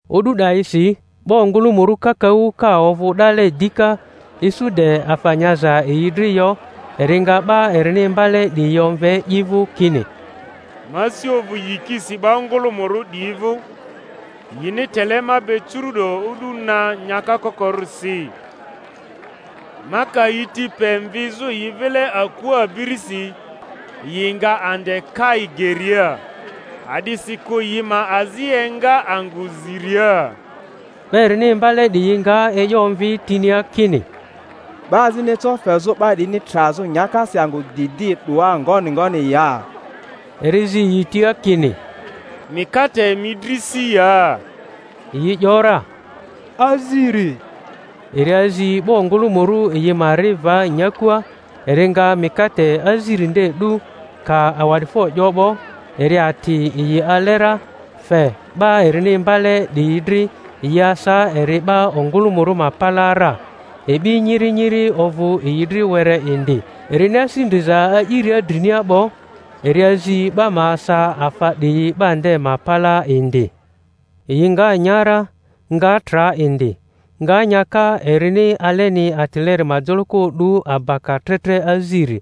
O'du 'dayisi 'ba ongᴜlᴜmᴜrᴜ kakaᴜ ka ovᴜ 'dale dika, isu de afa nyaza yi dri yo, eri nga 'ba erini imbale 'diyi omve i vᴜ kini, Ma asi ovᴜ yikisi 'ba ongᴜlᴜmᴜrᴜ 'diyi vᴜ, yini tele ma be curu'do o'du na nyaka kokorᴜrisi; ma ka yi ti pe mvizᴜ yi vile akua abirisi, yi nga ande kai geria; a'disikᴜ yi ma azi enga angᴜ ziria. 'Ba erini imbale 'diyi nga e'yo omvi tinia kini, 'Ba azini eco fezᴜ 'ba 'diyini trazᴜ nyakasi angᴜ didi 'doa ngoni ngoni ya? Eri zi yi tia kini, Mikate emi dri si ya? Yi ‘yora, Aziri. Eri azi 'ba ongᴜlᴜmᴜrᴜ yi ma ri va nyakua; eri nga mikate aziri nde 'du, ka awa'difo 'yo 'bo, eri ati yi ale ra, fe 'ba erini iinbale ‘diyi dri, yi asa eri 'ba ongᴜlᴜmᴜrᴜ ma palaa ra. E'bi nyiri nyiri ovᴜ yi dri were indi; erini asi ndriza a'iria drinia 'bo, eri azi 'ba ma asa afa 'diyi 'ba nde ma palaa indi. Yi nga nya ra, nga tra indi; nga nyaka erini aleni atileri ma joloko o'du abaka tre tre aziri.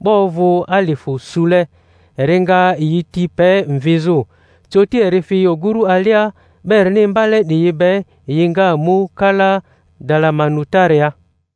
'Ba ovᴜ alifᴜ sule. Eri nga yi ti pe mvizᴜ. Coti eri fi oguru alia 'ba erini imbale 'diyi be, yi nga mu kala Dalamanutaaria.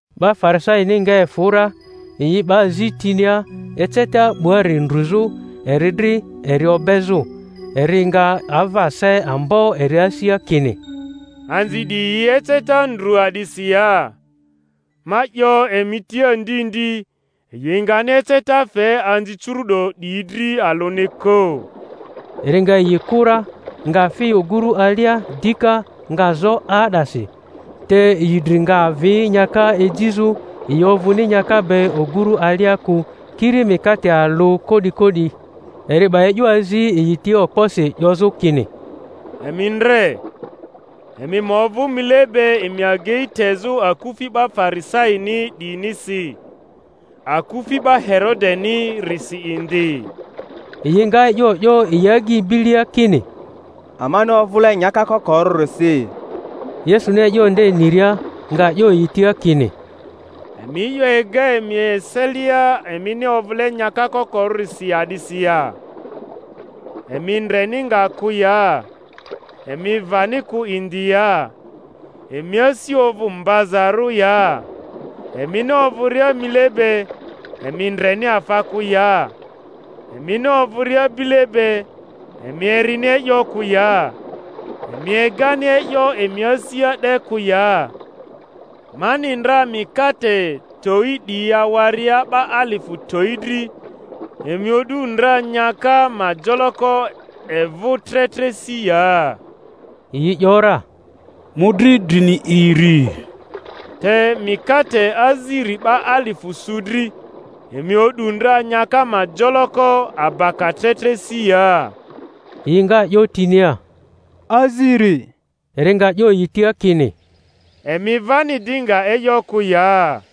'Ba Farisaini nga efᴜ ra, yi 'ba zi tinia, eceta 'buari ndruzᴜ eri dri eri obezᴜ. Eri nga ava se ambo eri asia, kini, Anzi 'diyi yi eceta ndru a'disi ya? Ma 'yo emi tia ndi ndi, yi ngani eceta fe anzi curu'do 'diyi dri alᴜni kᴜ. Eri nga yi kᴜ ra, nga fi oguru alia dika, nga zo 'aa'dasi. Te yi dri nga avi nyaka ejizᴜ; yi ovᴜni nyaka be oguru alia kᴜ, kiri mikate alᴜ ko'diko'di. Eri 'ba e'yo azi yi tia okposi, 'yozᴜ kini, Emi ndre, emi ma ovᴜ mile be emi agei tezᴜ akufi 'ba Farisaini 'diyinisi, akufi 'ba Herodenirisi indi. Yi nga e'yo 'yo yi agyi bilia, kini, Amani ovᴜle nyaka kokorᴜrisi. Yesuni e'yo nde niria, nga 'yo yi tia kini, Emi e'yo ega emi eselia emini ovᴜle nyaka kokorᴜrisi a'disi ya? Emi ndreni nga kᴜ ya? Emi vani kᴜ indi ya? Emi asi ovᴜ mbazarᴜ ya? Emini ovᴜria mile be, emi ndreni afa kᴜ ya? Emini ovᴜria bile be emi erini e'yo kᴜ ya? Emi egani e'yo emi asia de kᴜ ya? Mani ndra mikate towi 'diyi awaria 'ba alifᴜ towi dri, emi o'du ndranyaka ma joloko evᴜ tre tre si ya? Yi 'yora, Mᴜdri drini iri. Te mikate aziri 'ba alifᴜ su dri, emi o'du ndra nyaka ma joloko abaka tre tre si ya? Yi nga 'yo tinia, Aziri. Eri nga 'yo yi tia kini, Emi vani di nga e'yo kᴜ ya?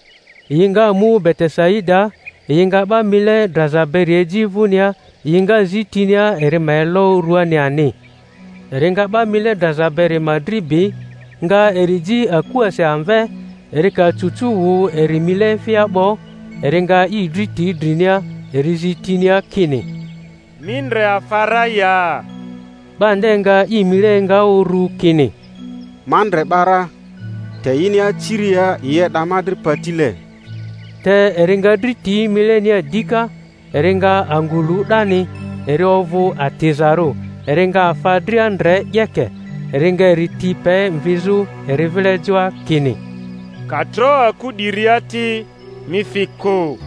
Yi nga mu Betesaidaa. Yi nga 'ba mile draza beri eji vᴜnia, yi nga zi tinia eri ma elo ruani ani. Eri nga 'ba mile draza beri ma dri bi, nga eri ji akuasi amve; eri ka cucu wᴜ eri mile efia 'bo, eri nga i dri ti drinia, eri zi tinia kini, Mi ndre afa ra ya? 'Ba nde nga i mile enga uru, kini, Ma ndre 'ba ra, te yini aciria yi e'da ma dri patile. Te eri nga dri ti milenia dika; eri nga angᴜ lu 'dani, eri ovᴜ atizarᴜ, eri nga afa dria ndre 'yeke. Eri nga eri ti pe mvizᴜ eri vile joa, kini, Ka tro aku 'diria ti, mi fi kᴜ.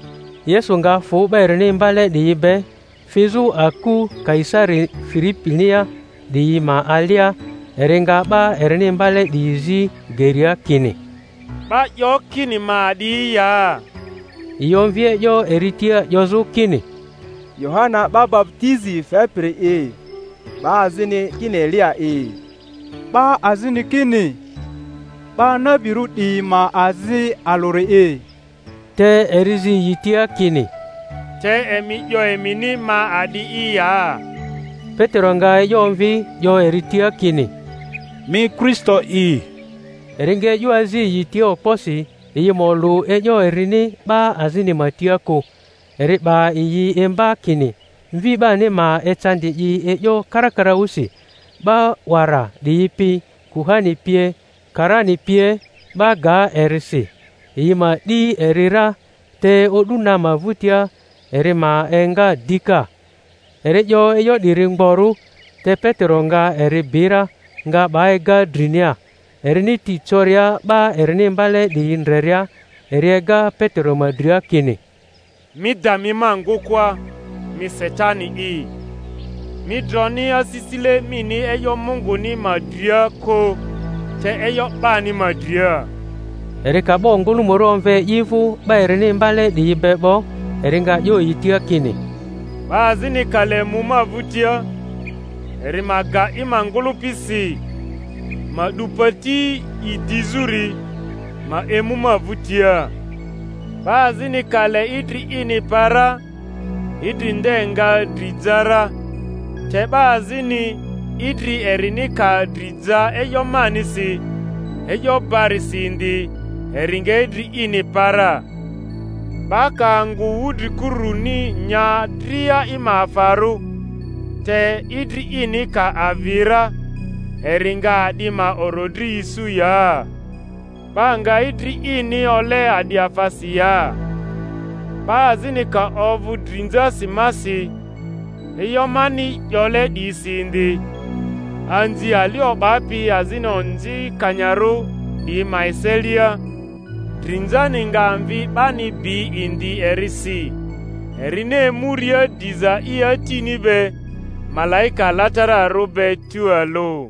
Yesu nga fᴜ 'ba erini imbale 'diyi be, fizᴜ aku Kaisari Filipinia 'diyi ma alia; eri nga 'ba erini imbale 'diyi zi geria, kini, 'Ba 'yo kini ma a'di ya? Yi omvi e'yo eri tia 'yozᴜ kini, Yohana 'ba baputizi fepiri’i; 'ba azini kini Eliya'i; 'ba azini kini 'ba nabirᴜ 'diyi ma azi alᴜri'i. Te eri zi yi tia kini, Te emi 'yo emini ma a'di'i ya? Petero nga e'yo omvi, 'yo eri tia kini, Mi Kristo'i. Eri nga e'yo azi yi tia okposi yi ma olᴜ e'yo erini 'ba azini ma tia kᴜ. Eri 'ba yi imba kini Mvi 'bani ma ecandi i e'yo karakaraᴜsi, 'ba 'wara 'diyi pi, kuhani pie, karani pie ma ga eri si, yi ma 'di eri ra, te o'du na ma vᴜtia eri ma enga dika. Eri 'yo e'yo 'diri mgborᴜ. Te Petero nga eri bi ra, nga 'ba ega drinia. Erini ti coria 'ba erini imbale 'diyi ndreria, eri ega Petero ma dria kini, Mi da mi ma ngᴜkᴜa, mi Satani'i! Mi droni asisile mini e'yo Munguni ma dria kᴜ, te e'yo 'bani ma dria. Eri ka 'ba ongᴜlᴜmᴜrᴜ omve i vᴜ 'ba erini imbale 'diyi be 'bo, eri nga 'yo yi tia kini, 'Ba azini ka le mu ma vᴜtia, eri ma ga i ma ngᴜlᴜpi si, ma 'du pati i dizᴜri, ma emu ma vᴜtia. 'Ba azini ka le idri ini pa ra, idri nde nga dri ja ra; te 'ba azini, idri erini ka dri ja e'yo manisi, e'yo barisi indi, eri nga idri ini pa ra. 'Ba ka angᴜ wudrikuruni nya dria i ma afarᴜ, te idri ini ka avi ra, eri nga a'di ma orodri isu ya? 'Ba nga idri ini ole a'di afasi ya? 'Ba azini ka ovᴜ drinzasi masi, e'yo mani 'yole 'diyisi indi, anzi ali o'bapi azini onzikanyarᴜ 'diyi ma eselia, drinzani nga Mvi 'bani bi indi erisi, erini emuria diza i Atini be, malaika alatararᴜ be tualᴜ.